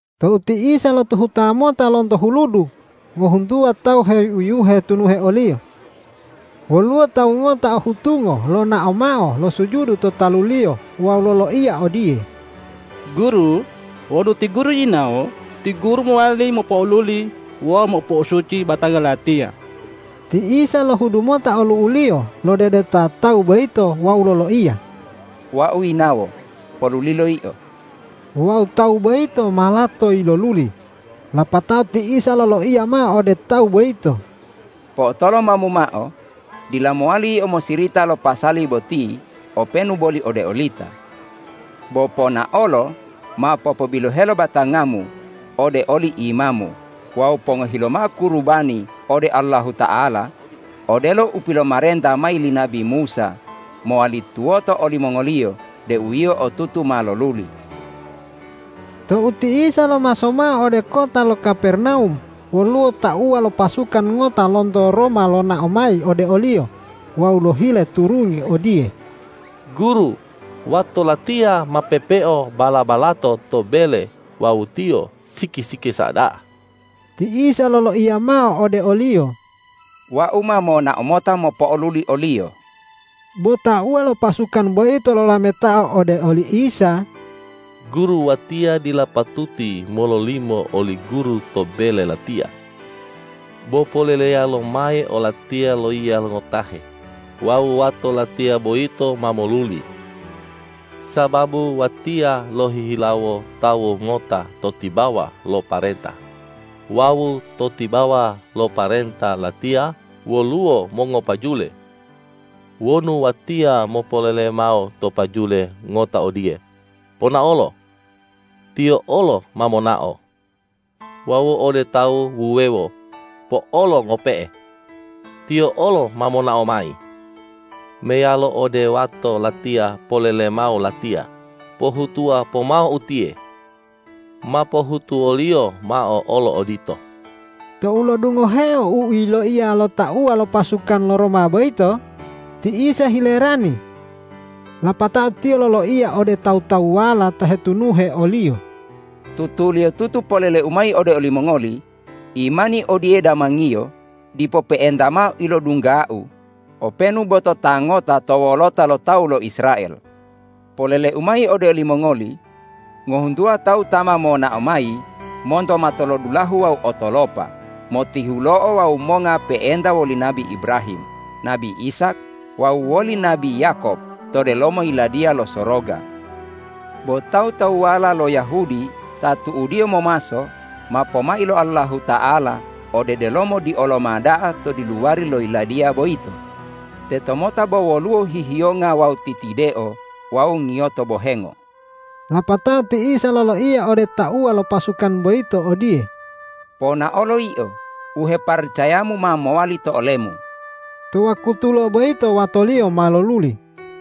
Tou ti Isa lotuhuta mota lonto huludu, ngohuntuwa tawu heuyuhe hetunuhe o-Liyo. Woluwo tawu ngota o hutungo lonao mao losujudu to talu-Liyo wawu loloiya odiye,”Guru, wonu ti Guru yinawo, ti Guru mowali mopo'oluli wawu mopo'osuci batanga latiya.” Ti Isa lohudu mota olu'u-Liyo lodedeta tawu boyito wawu loloiya,”Wau yinawo. Polulilo yio.” Wawu tawu boyito ma lato yiloluli. Lapatao ti Isa loloiya mao ode tawu boyito,”Po'otolomamu mao, dila mowali yio mosirita lo pasali boti openu boli ode olita. Bo ponaolo mao popobilohelo batangamu ode oli imamu wawu pongohi lomao kurubani ode Allahuta'ala odelo u pilomarenta mayi li nabi Musa mowali tuwoto olimongoliyo deu yio otutu ma loluli.” Tou ti Isa lomaso mao ode kota lo Kapernawum, woluwo tauwa lo pasukan ngota lonto Roma lonao mayi ode o-Liyo wawu lohile turungi odiye, ”Guru, wato latiya ma pepeo bala-balato to bele wawu tiyo siki-sikisa da'a.” Ti Isa loloiya mao ode oliyo,”Wau ma monao mota mopo'oluli oliyo.” Bo tauwa lo pasukan boyito lolametao ode oli Isa,”Guru, watiya dila patuti mololimo oli Guru to bele latiya. Bo poleleya lomayi olatiya loiya ngotahe wawu wato latiya boyito ma moluli. Sababu watiya lohihilawo tawu ngota to tibawa lo parenta wawu to tibawa lo parenta latiya woluwo mongopajule. Wonu watiya mopolele mao to pajule ngota odiye: Ponaolo! Tiyo olo ma monao. Wawu ode tawu wuwewo: Po'olo ngope'e! Tiyo olo ma monao mayi. Meyalo ode wato latiya polele mao latiya: Pohutuwa pomao utiye! Ma pohutuwoliyo mao olo odito.” Tou lo'odungoheo u yiloiya lo tauwa lo pasukan lo Roma boyito, ti Isa hilerani. Lapatao Tiyo loloiya ode tawu-tawuwala ta hetunuhe o-Liyo,”Tutuliyotutu polele-U mayi ode olimongoli: Imani odiye damangiyo dipo pe'enta mao ilodungga-U openu bo to ta ngota to wolota lo tawu lo Israel. Polele-U mayi ode olimongoli: Ngohuntuwa tawu ta ma monao mayi monto matolodulahu wawu otolopa motihulo'o wawu monga pe'enta woli nabi Ibrahim, nabi Ishak wawu woli nabi Yakob to delomo Yiladiya lo Soroga. Bo tawu-tawuwala lo Yahudi ta tu'udiyo momaso ma pomai lo Allahuta'ala ode delomo dioloma da'a to diluwari lo Yiladiya boyito. Tetomota bo woluwo hihiyonga wawu titideo wawu ngiyoto bohengo.” Lapatao ti Isa loloiya ode tauwa lo pasukan boyito odiye,”Ponaolo yio, u heparacayamu ma mowali to olemu.” To wakutulo boyito watoliyo ma loluli.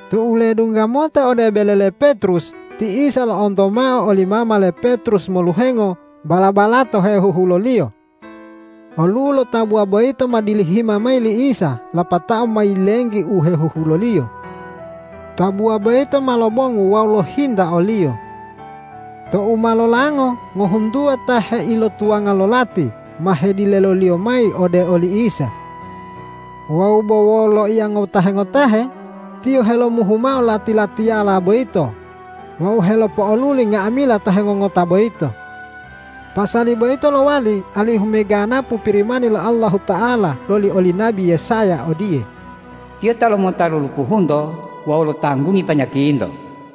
Tou ledungga mota ode bele le Petrus, ti Isa lo'onto mao oli mama le Petrus moluhengo bala-balato hehuhuloliyo. Olu'u lo tabuwa boyito ma dilihima mayi li Isa lapatao ma yilenggi u hehuhuloliyo. Tabuwa boyito ma lobongu wawu lohinta o-Liyo. Tou ma lolango ngohuntuwa ta heilotuwanga lo lati ma hedileliyo mayi ode oli Isa. Wawu bo wolo loiya ngotahe-ngotahe Tiyo helomuhu mao lati-latiyala boyito wawu helopo'oluli nga'amila ta hengongota boyito. Pasali boyito lowali alihu meganapu Pirimani lo Allahuta'ala loli oli nabi Yesaya odiye,”Tiyo ta lomota lulupuhunto wawu lotanggungi panyakinto.”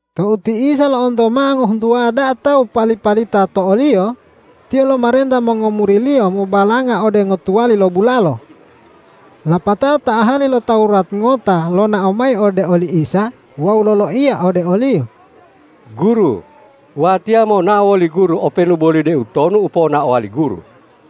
Tou ti Isa lo'onto mao ngohuntuwa da'a tawu pali-palita to o-Liyo, Tiyo lomarenta mongomuri-Liyo mobalanga ode ngotuwali lo bulalo. Lapatao ta ahali lo Tawurat ngota lonao mayi ode oli Isa wawu loloiya ode o-Liyo,”Guru, watiya monao woli Guru openu boli deutonu u ponaowa li Guru.”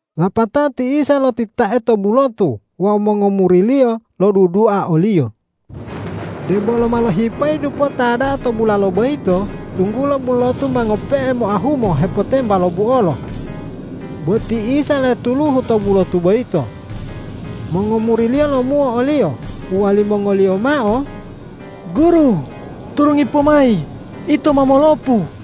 Lapatao ti Isa lotitae to bulotu wawu mongomuri-Liyo lodudua o-Liyo. Debolo ma lohipayi dupota da'a to bulalo boyito, tunggulo bulotu ma ngope'e moahumo hepotemba lo buolo. Bo ti Isa letuluhu to bulotu boyito. Mongomuri-Liyo lomuo o-Liyo uwalimongoliyo mao,”Guru, turungi pomayi, ito ma molopu!”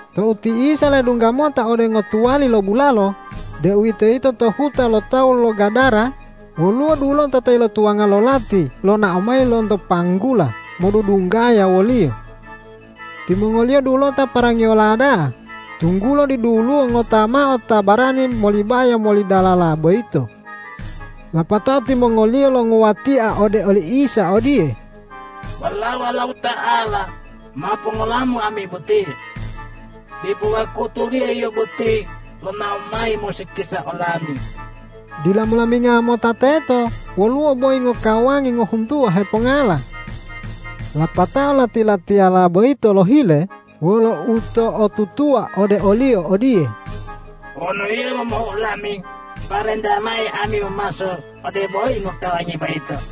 Tou ti Isa ledungga mota ode ngotuwali lo bulalo, deuwitoyito to huta lo tawu lo Gadara, woluwo dulota ta ilotuwanga lo lati lonao mayi lonto panggula modudunggaya wo-Liyo. Timongoliyo dulota parangiyola da'a, tunggulo diduluwo ngota mao ta barani molibaya moli dalala boyito. Lapatao timongoliyo longuwatia ode oli Isa odiye,”Walao Allahuta'ala, ma pongola-Mu ami boti? Dipo wakutuliyo Yio boti lonao mayi mosikisa olami.” Dila molaminga mota teto woluwo boyi ngokawangi ngohuntuwa hepongala. Lapatao lati-latiyala boyito lohile wolo uto'otutuwa ode o-Liyo odiye,”Wonu Yio momuhu olami, parentayi mayi ami momaso ode boyi ngokawangi boyito.”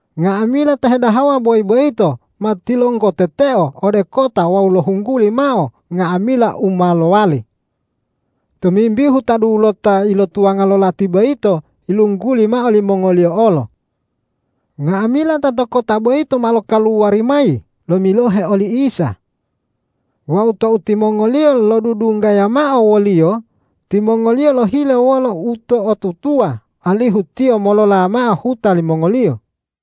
Nga'amila ta hedahawa boyi boyito ma tilonggoteteo ode kota wawu lohungguli mao nga'amila u ma lowali. Tomimbihu ta dulota ilotuwanga lo lati boyito yilungguli mao limongoliyo olo. Nga'amila ta to kota boyito ma lokaluwari mayi lomilohe oli Isa. Wawu tou timongoliyo lodudunggaya mao wo-Liyo, timongoliyo lohile wolo uto'otutuwa alihu Tiyo molola mao huta limongoliyo.